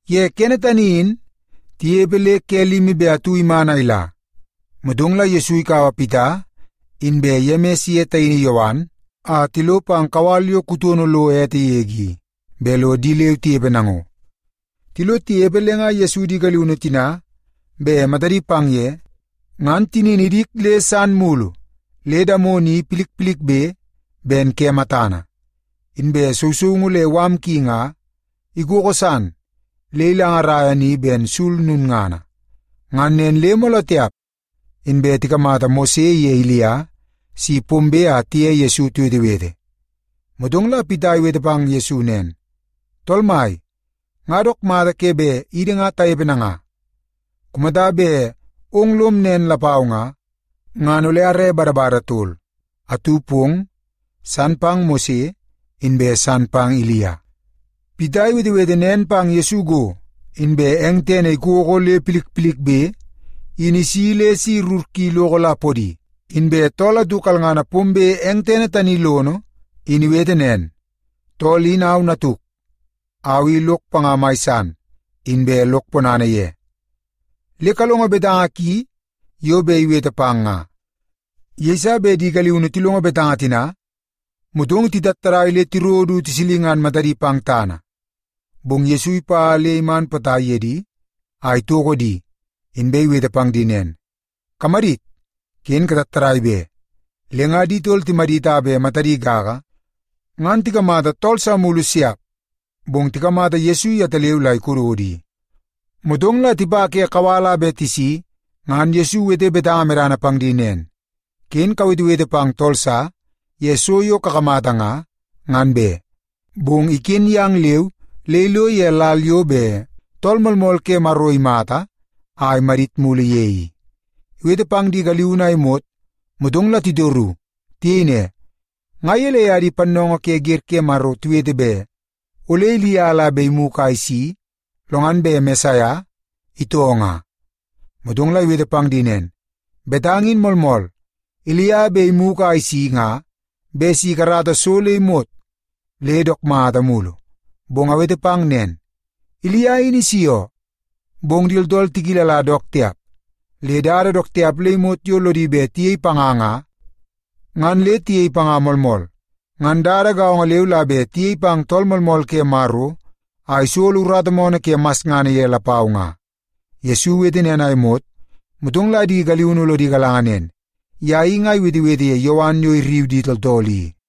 Ye kene tani in, tinepe le ke limi be atu iman a ila, motong la Yesu ikaua Pita inbe Yemis iye taini Yowan a tilo pang kawal yo kutono lo ete yege i, bet lo di leu tinepe nango. Tilo tinepe le nga Yesu di galiunu tina bet matadi pang ye, ngan tinini idik le san mulu le damono i milmilbe ben ke matana, inbe sousoungu le mala ki nga ikoko san le ilangaraia ni ben sul lulngana. Ngan nen le mooloo tiap, inbe tikamata Mose iye Ilia si pombe a tiye Yesu tiwetewete. Motong la Pita iwete pang Yesu nen, “Tool Mai, nga dook mata ke bet idi nga tanepe nanga. Kumata bet ong lom nen lapau nga, ngan ole are badabada tol; atu pong, san pang Mose, inbe san pang Ilia.” Pita iwetewete nen pang Yesu go, inbe eng tene ikoko le milmilbe, in isi le si rur ki iloko la podi. Inbe tool atu kalngana pombe eng tene tani lono in iwete nen, “Tool in au natuk. Au i lok panga mai san, inbe lok ponana ye. Le kalongo betanga ki yo bet iwete pang nga!” Yeiso bet di galiunu tilongo betanga tina, motong titattadai le tiro du tisilingan matadi pang tana. Bong Yesu ipa le iman potai ye di a itoko di, inbe iwete pang di nen, “Kamadit! Ken katattadai be!” Le nga di tol timadit a bet matadi gaga, ngan tikamata tool sa mulu siap, bong tikamata Yesu yetaleu la ikododo i. Motong la tipa ke kawal a bet tisi, ngan Yesu iwete betanga medana pang di nen, “Ken kawetewete pang tool sa ye so yo kakamata nga, ngan be. Bong iken yang leu le ilo ye lal yo bet Tool Moolmool ke Maro imata a imadit mulu ye i.” Iwete pang di galiunu a imot, motong la titoru. Tiyei ne, “Nga gelei a di pannoongoo ke wer ke Maro tiwete bet ole Ilia la bet imugu a isi, lo ngan bet Mesaia itoo nga?” Motong la iwete pang di nen, “Betanga in moolmool. Ilia bet imugu a isi nga bet si ikarata so le imot le dook mata mulu. Bong awete pang nen, Ilia in isi oo. Bong di tooltool tikilala dook tiap, le dada dook tiap le imot yo lodi bet tiyei panga nga, ngan le tiyei panga moolmool. Ngan dada gaongo leu la bet tiyei pang Tool Moolmool ke Maro a isolo urata moonoo ke masngana ye lapau nga.” Yesu iwete nen a imot, motong la di galiunu lodi galanga nen, ye i nga iwetewete ye Yowan yo irriu di tooltool i.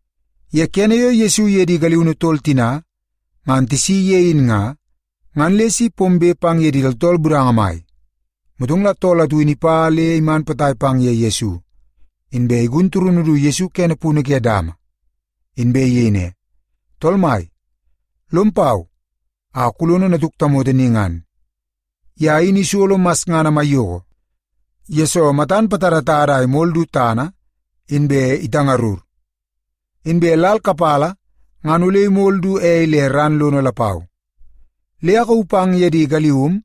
Ye kene yo Yesu iye di galiunu tol tina ngan tisi ye in nga, ngan le si pombe pang ye di tooltool budanga mai. Motong la tool atu in ipa le iman potai pang ye Yesu, inbe igun turunu du kene punu ke dama. Inbe iyei ne, “Tool Mai, lom pau a kulono natuk tamoto ni ngan. Ye in isolo masngana maiyoko, yesoo matan patadatada a imol du tana, inbe itangurngur. Inbe lal kapala ngan ole imol du ei le ran lono lapau. Le akauu pang ye di galium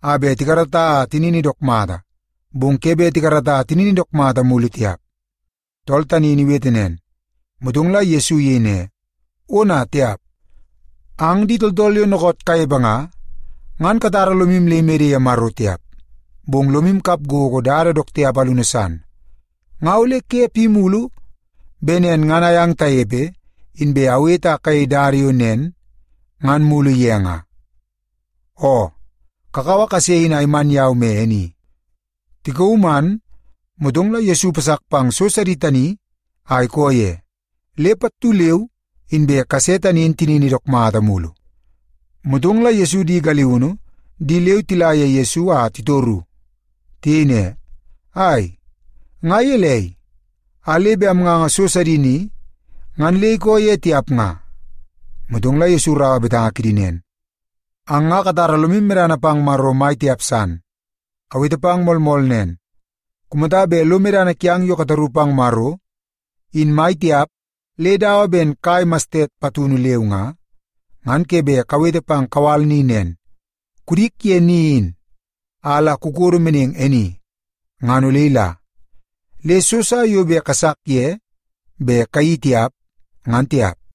a bet tikarata a tinini dook mata, bong ke bet tikarata a tinini dook mata mulu tiap.” Tool tani iwete nen, motong la Yesu iyei ne, “Ona tiap! Ang di tooltool yo dookoot kanepe nga, ngan katara lomu le imede ye Maro tiap, bong lomu kap gogo dada dook tiap alunu san. Nga ole ke pi mulu bet nen ngan ayang tanepe, inbe awete a kayei dada yo nen ngan mulu ye nga? Oo, kakaua kase in a iman yau me e ni.” Tikauu man, motong la Yesu ipasak pang so sidi tani a ikoo ye, le pattu leu inbe kase tani in tinini dook mata mulu. Motong la Yesu di galiunu di leu tila ye Yesu la titoru. Tiyei ne, “Ai, nga gelei, a le bet amnganga so sidi ni, ngan le ikoo ye tiap nga?” Motong la Yesu iraua betanga kidi nen, “Ang nga katara lomu medana pang Maro mai tiap san. Awete pang moolmool nen, kumata bet lo medana kiang yo kataru pang Maro, in mai tiap le dawa ben kai mastet patunu leu nga, ngan ke bet kawete pang kawal ni nen, ‘Kudik ye ni in, a la kukodo meneng e ni’, ngan ole ila. Le so sa yo bet kasak ye bet kayeii tiap, ngan tiap.”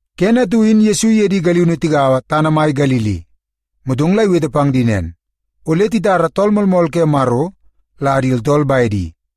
Kene atu in Yesu iye di galiunu tigaua tana mai Galili, motong la iwete pang di nen, “Ole titara Tool Moolmool ke Maro la di tooltool bedi,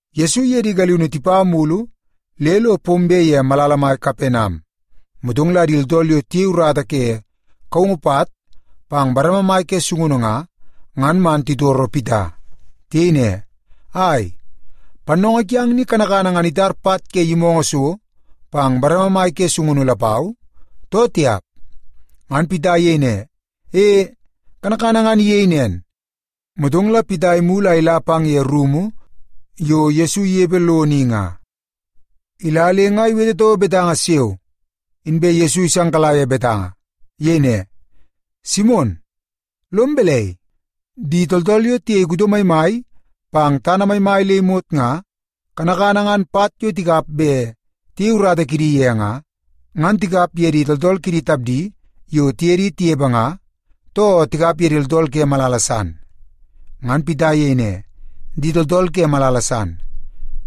Yesu iye di galiunu tipa mulu le lo pombe ye malala mai Kapenam, motong la di tooltool yo tiyei urata ye kaungu pat pang bareme mai ke sungunu nga, ngan man titoro Pita. Tiyei ne, “Ai, pannoongoo kiang ni kanakana ngan itar pat ke yimoongoo so pang bareme mai ke sungunu lapau, too tiap?” Ngan Pita iyei ne, “E, kanakana nga iyei nen.” Motong la Pita imulu a ila pang ye rumu yo Yesu inepe lono i nga. Ila le nga iwete toko betanga siao, inbe Yesu isangkala ye betanga. Iyei ne, “Simon, lom balai? Di tooltool yo tiyei kuto maimai pang tana maimai le imot nga, kanakana ngan pat yo tikap bet tiyei urata kidi ye nga, ngan tikap ye di tooltool kidi tapdi yo tiye di tinepe nga, too tikap ye di tooltool ke malala san?” Ngan Pita iyei ne, “Di tooltool ke malala san.”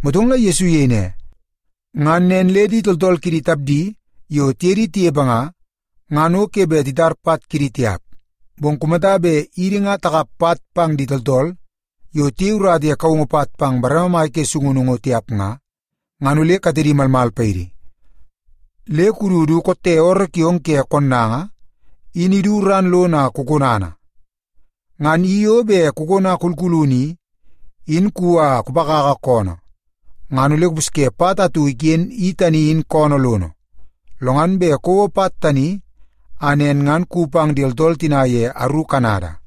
Motong la Yesu iyei ne, “Ngan nen le di tooltool kidi tapdi yo tiye di tinepe nga, ngan o ke bet titar pat kidi tiap. Bong kumata bet idi nga takap pat pang di tooltool yo tiyei urata ye kaungu pat pang bareme mai ke sungunu ngo tiap nga, ngan ole katedi malmal paidi. Le kudu du kotte ooroo kiong ke konnanga in idu ran lono a kukonana. Ngan i yo bet kukona kulkulunu i, in kuwi a kupakaka koonoo, ngan ole kupusye pat atu iken i tani in koonoo lono. Lo ngan bet kouo pat tani, a nen ngan kuwi pang di tooltool tina ye aru kanada.”